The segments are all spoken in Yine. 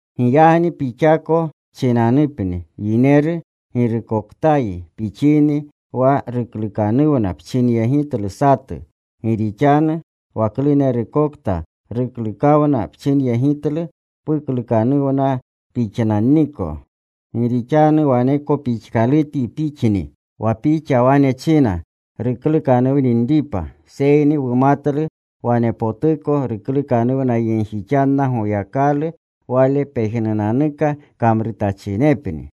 Giyagni pixako pchinanupni, yineru, girukoktayi pixini wa ruklukanuwna pchinyegitlu satu. Gi rixanu wa klunerukokta ruklukanuwna pchinyegitlu, pukluknanwa pixnanniko. Gi rixanu waneko pixkalutunyi pixni, wa pixa wane china ruklukanuwninripa. Seyni wumatlu wanepotuko ruklukanuwnayegjixanna Goyakalu wale pejnunanuka kamrutachinepni.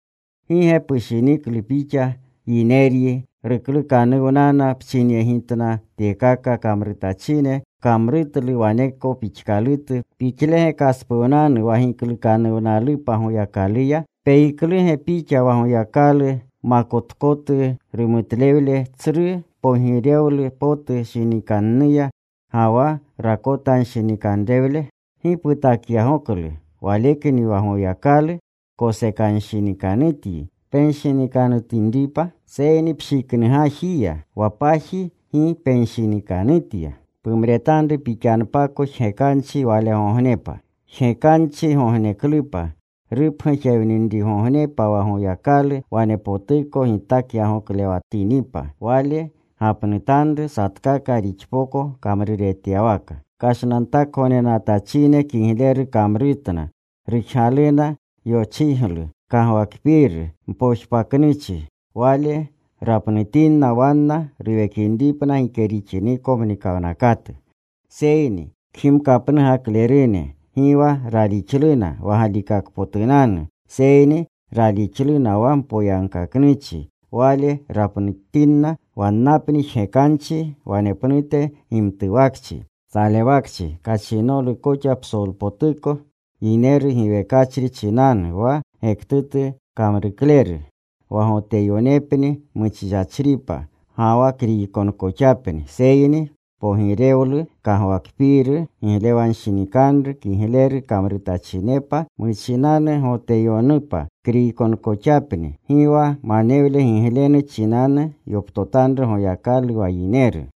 ¿Gi ge pushiniklu pixa, yineryi, ruklukanuwnana pchinyegitna tyekaka kamrutachine, pkamrutlu waneko pixkalutu: pixlege kaspuwnanu wa giklukanuwnalupa Goyakaluya? ¿Peyikluge pixa wa Goyakalu makotkotu rumutlewle, tsru pogirewlu potu shinikannuya, ga wa rakotanshinikanrewle? ¿Gi putakyagoklu walekni, wa Goyakalu kosekanshinikanutyi penshinikanutinripa? Seyni pshiknugajiya, wa paji gi penshinikanutya, pumretanru pixanpako jgekanchi walegognepa jgekanchigogneklupa, rupgujewninrigognepa wa Goyakalu wanepotuko gitakyagoklewatinipa. Wale gapnutanru satkaka rixpoko kamruretyawaka. Kashnantakgognenatachine kigleru kamrutna, rujgaluna yochiglu, kagwakpiiru, mpojpaknuchi, Wale rapnutinna wanna ruwekinripna gike rixiniko mnikawnakatu. Seyni kgimkapnugaklerune, gi wa ralixluna wa galikakpotunanu, seyni ralixluna wa mpoyagkaknuchi, Wale rapnutinna wannapni jgekanchi wanepnute gimtuwakchi. Salewakchi, kachinolu koxa psolpotuko yineru giwekachri chinanu wa gektutu kamrukleru, wa Goteyonepni muchichachripa, ga wa Kriykonkoxapni. Seyni pogirewlu, kagwakpiiru, giglewanshinikanru kigleru kamrutachinepa, muchinanu Goteyonupa, Kriykonekoxapni. Gi wa manewle giglenu chinanu yoptotanru Goyakalu wa yineru.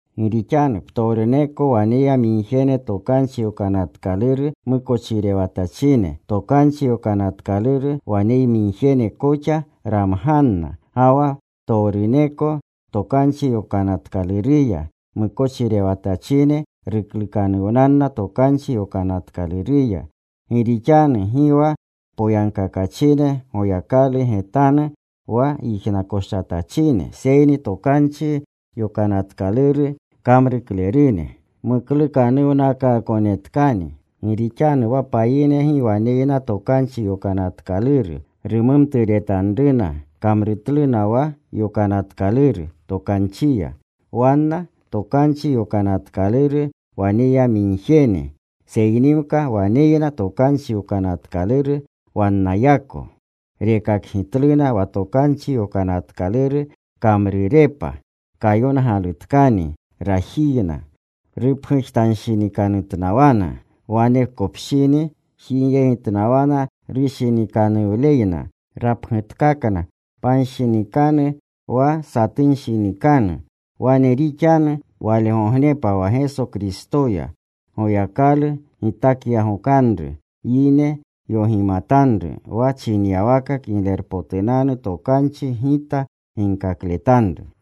Gi rixanu ptowruneko waneyamigjene Tokanchi Yokanatkaluru mukochirewatachine, Tokanchi Yokanatkaluru waneyamigjene koxa ramganna. Ga wa ptowruneko Tokanchi Yokanatkaluruya mukochirewatachine ruklukanuwnanna Tokanchi Yokanatkaluruya. Gi rixanu gi wa poyagkakachine Goyakalu getanuya wa yijnakoshatachine, seyni Tokanchi Yokanatkaluru kamruklerune muklukanuwnakaakonetkani. Gi rixanu wa payine gi waneyna Tokanchi Yokanatkaluru, rumumturetanruna kamrutluna wa Yokanatkaluru Tokanchiya, wanna Tokanchi Yokanatkaluru waneyamigjene, seynimka waneyna Tokanchi Yokanatkaluru wannayako. Rekakgitluna wa Tokanchi Yokanatkaluru kamrurepa kayongalutkani rajiyna. Rupgujtanshinikanutnawana. Wanekopshini jigyegitnawana rushinikanuwnaleyna. Rapgutkakna panshinikanu wa satunshinikanu. Wane rixanu walegognepa wa Geso Kristoya Goyakalu gitakyagokanru yine yogimatanru, wa chinyawaka Kiglerpotunanu Tokanchi gita ginkakletanru.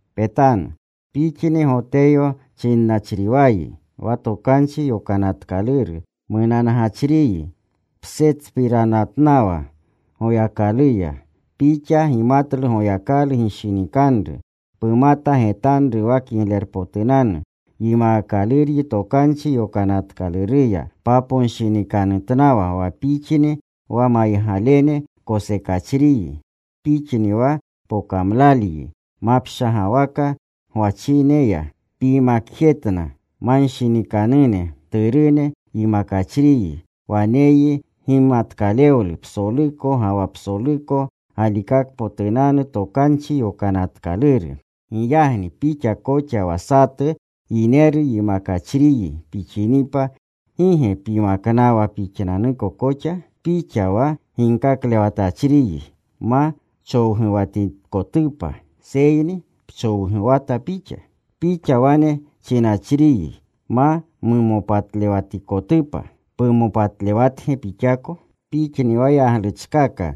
Petanu, pixni Goteyo chinnachriwayi, wa Tokanchi Yokanatkaluru munangachriyi. Ptserpiranatnawa Goyakaluya. Pixa gimatlu Goyakalu gishinikanru, pumata getanru wa kiglerpotu. Yimaakaluryi Tokanchi Yokanatkaluruya. Paponshinikanutnawa wa pixni wa maygalene kosekachriyi; pixni wa pokamlalyi mapshagawaka gwachineya. Pyimakjetna manshinikanune. Mturune yimakachriyi. Waneyyi gimatkalewlu psoluko ga wa psoluko galikakpotunanu Tokanchi Yokanatkaluru. Giyagni pixa koxa wa satu yineru yimakachriyi pixinipa, ¿gi ge pyimaknawa pixnanuko koxa? Pixa wa ginkaklewatachriyi ma chowguwatikotupa, seyni ¿pchowguwatawa pixa? Pixa wane chinachriyi ma mumopatlewatikotupa, ¿pumopatlewatge pixako? Pixni wa yagluchkaka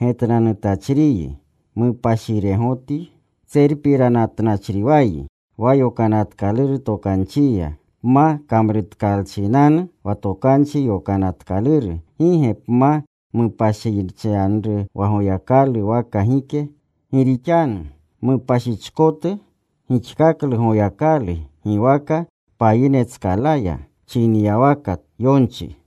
getnanutachriyi ¿mupashiregotyi? Tserpiranatnachriwayi wa Yokanatkaluru Tokanchiya. Pma kamrutkalchinanu wa Tokanchi Yokanatkaluru, ¿gi ge pma mupashichyanru wa Goyakalu waka gike? Gi rixanu mupashichkotu gixkaklu Goyakalu giwaka payinetskalaya, chinyawaka wa yonchi.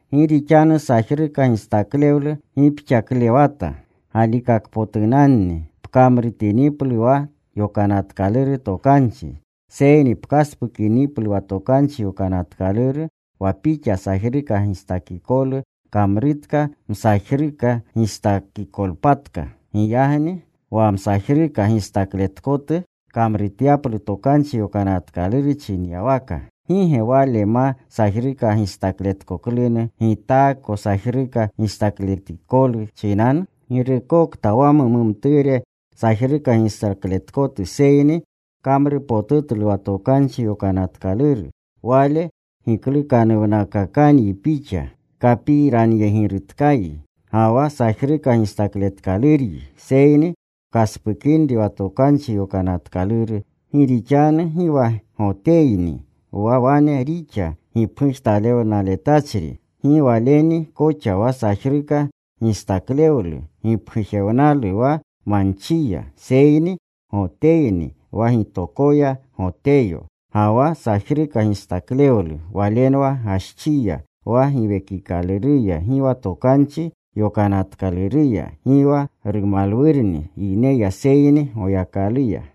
Gi rixanu sajruka gistaklewlu gipxaklewata galikakpotunanni, pkamrutiniplu wa Yokanatkaluru Tokanchi. Seyni pkaspukiniplu wa Tokanchi Yokanatkaluru, wa pixa sajruka gistakikolu kamrutka masajruka gistakikotpatka. Giyagni wa msajruka gistakletkotu kamrutyaplu Tokanchi Yokanatkaluru chinyawaka, ¿gi ge wale ma sajruka gistakletkoklunu gitaako sajruka gistakletikolu chinanu? Girukta wa mumumture sajruka gistakletkotu seyni kamrupotutlu wa Tokanchi Yokanatkaluru, wale giklukanuwnakakanyi pixa kapiranyegirutkayi, ga wa sajruka gistakletkaluryi, seyni pkaspukinri wa Tokanchi Yokanatkaluru. Gi rixanu gi wa Goteyni, wa wane rixa gipgujewnaletachrini, gi waleni koxa wa sajruka gistaklewlu gipgujewnalu wa manchiya. Seyni Goteyni wa gitokoya Goteyo, ga wa sajruka gistaklewlu walenwa gaschiya, wa giwekikaluruya gi wa Tokanchi Yonatkaluruya. Gi wa rumalwurni yineya seyni Goyakaluya.